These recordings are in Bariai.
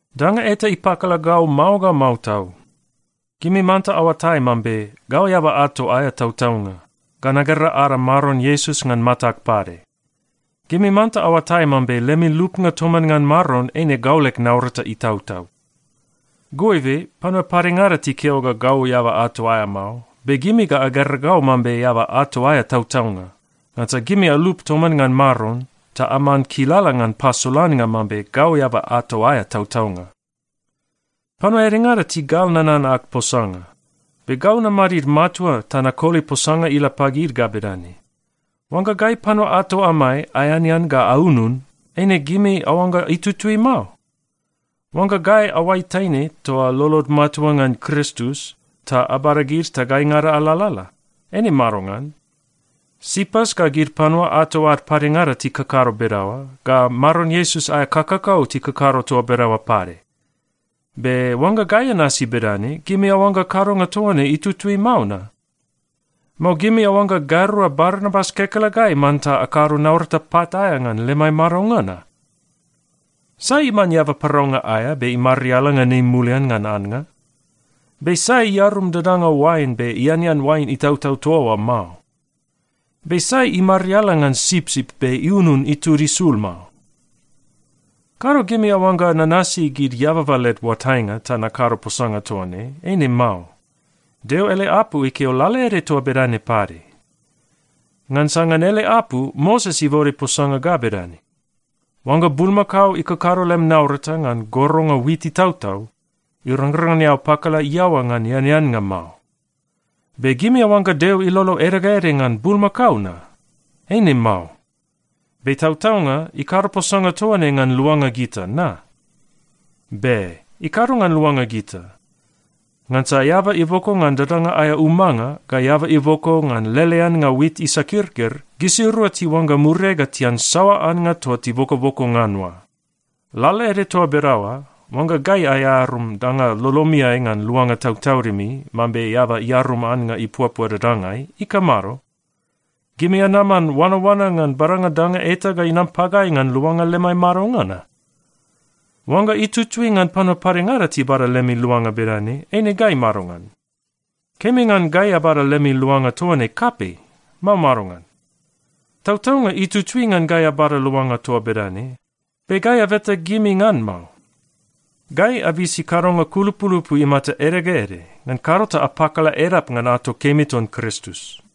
Danga eta ipakala gau mao ga mao tau. Gimi manta aoatai mambe gau eaba ato aea tautaunga, ga nagera ada Maron Iesus ngan matag pade. Gimi manta aoatai mambe lemi lupnga toman ngan Maron eine gau leg naurata itautau. Goibe panua padengada tikeo ga gau eaba ato aea mao, be gimi ga agera gau mambe eaba ato aea tautaunga, ngansa gimi alup toman ngan Maron ta aman kilala ngan pasolannga mambe gau eaba ato aea tautaunga. Panua edengada tigal nanan ag posanga, be gau namadid matua ta nakoli posanga ila pagid ga bedane: Oangga gai panua ato amai aeanean ga aunun, eine gimi aoangga itutui mao? Oangga gai aoai taine toa lolod matua ngan Kristus, ta abada gid ta gaingada alalala, eine madongan? Sipas ga gid panua ato ad padengada tikakado bedaoa, ga Maron Iesus aea kakakau tikakado toa bedaoa pade. Be oangga gai anasi bedane, gimi aoangga kadonga toa ne itutui mao na? Mao gimi aoangga gairua Barnabas kekelegai manta akado naurata pat aea ngan lemai madonga na? Sai iman eaba paraunga aea be imariala ngan ei mulian ngan annga? Be sai iarum dadanga oain be ianean oain itautau toa oa mao? Be sai imariala ngan sipsip be iunun itud isul mao? Kado gimi aoangga nanasi gid eababa led oatainga ta nakado posanga toa ne. Eine mao. Deo ele apu ikeo lalaede toa bedane pade. Ngansa ngan ele apu, Moses ibode posanga ga bedane, “Oangga bulmakao ikakado lem naurata ngan goronga wit itautau, irangrang ngan eao pakala iaoa ngan eaneannga mao.” Be gimi aoangga Deo ilolo ede ga ede ngan bulmakao na? Eine mao. Be tautaunga ikado posanga toa ne ngan luanga gita, na? Be, ikado ngan luanga gita. Ngansa eaba iboko ngan dadanga aea umanga, ga eaba iboko ngan leleannga wit isakirkir, gisirua tiuangga muriai ga tian saoa annga toa tibokoboko ngan oa. Lalaede toa bedaoa, oangga gai aearum danga lolomiai ngan luanga tautaudimi mambe eaba iarum annga ipuapua dadangai, ikamado? Gimi anaman oanaoana ngan badanga danga eta ga inam pagai ngan luanga lemai madonga na? Oangga itutui ngan panua padengada tibada lemi luanga bedane, eine gai madongan? Kemi ngan gai abada lemi luanga toa ne kapei, mao madongan? Tautaunga itutui ngan gai abada luanga toa bedane, be gai abeta gimi ngan mao. Gai abisi kadonga kulupulupu imata ede ga ede, ngan kado ta apakala edap ngan ato kemi ton Kristus.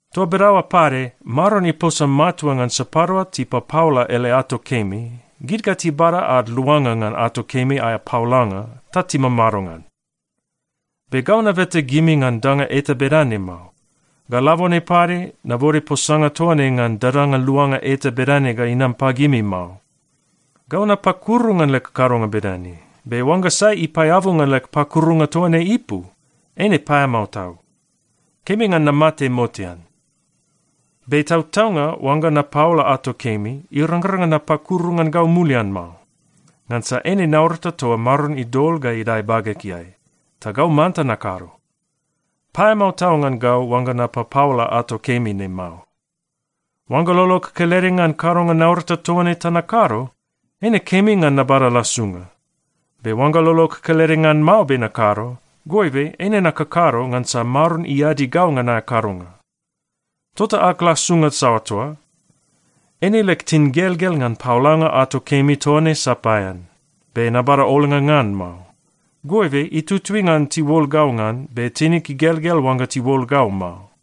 Toa bedaoa pade, Maron iposa matua ngan sapadua tipapaola ele ato kemi, gid ga tibada ad luanga ngan ato kemi aea paolanga ta timamado ngan. Be gau nabeta gimi ngan danga eta bedane mao. Ga labone pade nabode posanga toa ne ngan dadanga luanga eta bedane ga inam pagimi mao. Gau napakuru ngan leg kadonga bedane, be oangga sai ipaeabu ngan leg pakurunga toa ne ipu, eine paeamao tau. Kemi ngan namate motean! Be tautaunga oangga napaola ato kemi, irangrang ngan napakuru ngan gau mulian mao, ngansa eine naurata toa Maron idol ga idae bagegeai, ta gau manta nakado. Paeamao tau ngan gau oangga napapaola ato kemi ne mao! Oangga lolog kelede ngan kadonga naurata toa ne ta nakado, eine kemi ngan nabada lasunga. Be oangga lolog kelede ngan mao be nakado, goibe eine nakakado ngansa Maron iadi gau ngan aea kadonga. Tota ag lasunga saoa toa? Eine leg tingelgel ngan paolanga ato kemi toa ne sapaean, be nabada olnga ngan mao. Goibe itutui ngan tiuol gau ngan, be tinig igelgel oangga tiuol gau mao.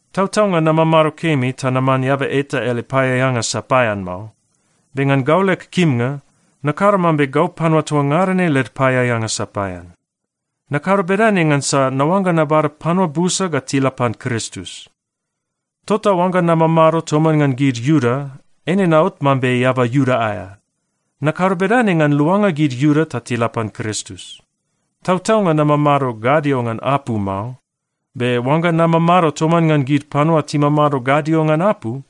Tautaunga namamado kemi ta naman eaba eta ele paeaeanga sapaean mao, be ngan gau leg kimnga, nakado mambe gau panua toa ngada ne led paeaeanga sapaean. Nakado bedane ngansa naoangga nabada panua busa ga tila pan Kristus. Tota oangga namamado toman ngan gid Iuda, eine naot mambe eaba Iuda aea. Nakado bedane ngan luanga gid Iuda ta tila pan Kristus. Tautaunga namamado gadio ngan apu mao, be oangga namamado toman ngan gid panua timamado gadio ngan apu,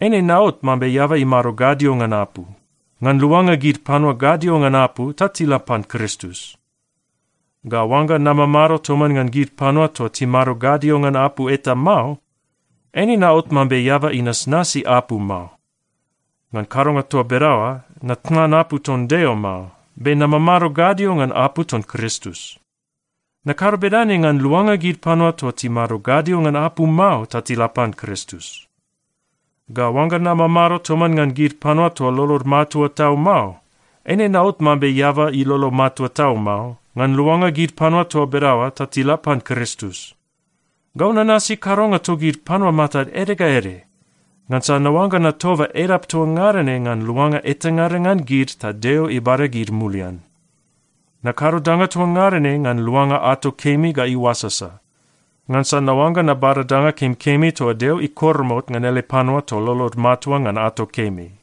eine naot mambe eaba imado gadio ngan apu, ngan luanga gid panua gadio ngan apu ta tila pan Kristus. Ga oangga namamado toman ngan gid panua toa timado gadio ngan apu eta mao, eine naot mambe eaba inasnasi apu mao. (Ngan kadonga toa bedaoa, natnan apu ton Deo mao. Be namamado gadio ngan apu ton Kristus.) Nakado bedane ngan luanga gid panua toa timado gadio ngan apu mao ta tila pan Kristus. Ga oangga namamado toman ngan gid panua toa lolod matua tau mao, eine naot mambe eaba ilolo matua tau mao, ngan luanga gid panua toa bedaoa ta tila pan Kristus. Gau nanasi kadonga togid panua matad ede ga ede, ngansa naoangga natoba edap toa ngada ne ngan luanga etangada ngan gid ta Deo ibada gid mulian. Nakado danga toa ngada ne ngan luanga ato kemi ga iuasasa, ngansa naoangga nabada danga kemikemi toa Deo ikoromot ngan ele panua toa lolod matua ngan ato kemi.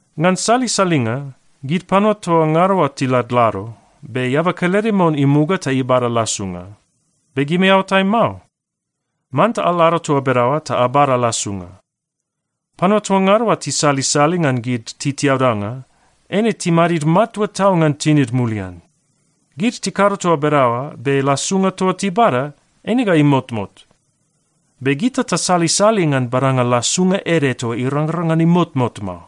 Ngan salisalinga, gid panua toa ngada oa tiladlado, be eaba kelede mon imuga ta ibada lasunga. Be gimi aoatai mao? Manta alado toa bedaoa ta abada lasunga. Panua toa ngada oa tisalisali ngan gid titiaudanga, eine timadid matua tau ngan tinid mulian. Gid tikado toa bedaoa, be lasunga toa tibada, eine ga imotmot. Be gita tasalisali ngan badanga lasunga ede toa irangrang ngan imotmot mao.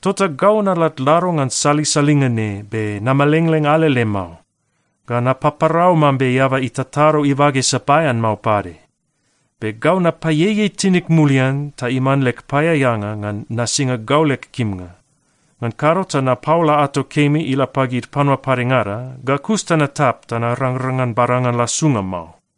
Tota gau naladlado ngan salisalinga ne be namelengleng alele mao. Ga napaparau mambe eaba itatado ibage sapaean mao pade. Be gau napaieiei tinig mulian ta iman leg paeaeanga ngan nasinga gau leg kimnga. Ngan kado ta napaola ato kemi ila pagid panua padengada, ga kus ta natap ta narangrang ngan badanga lasunga mao.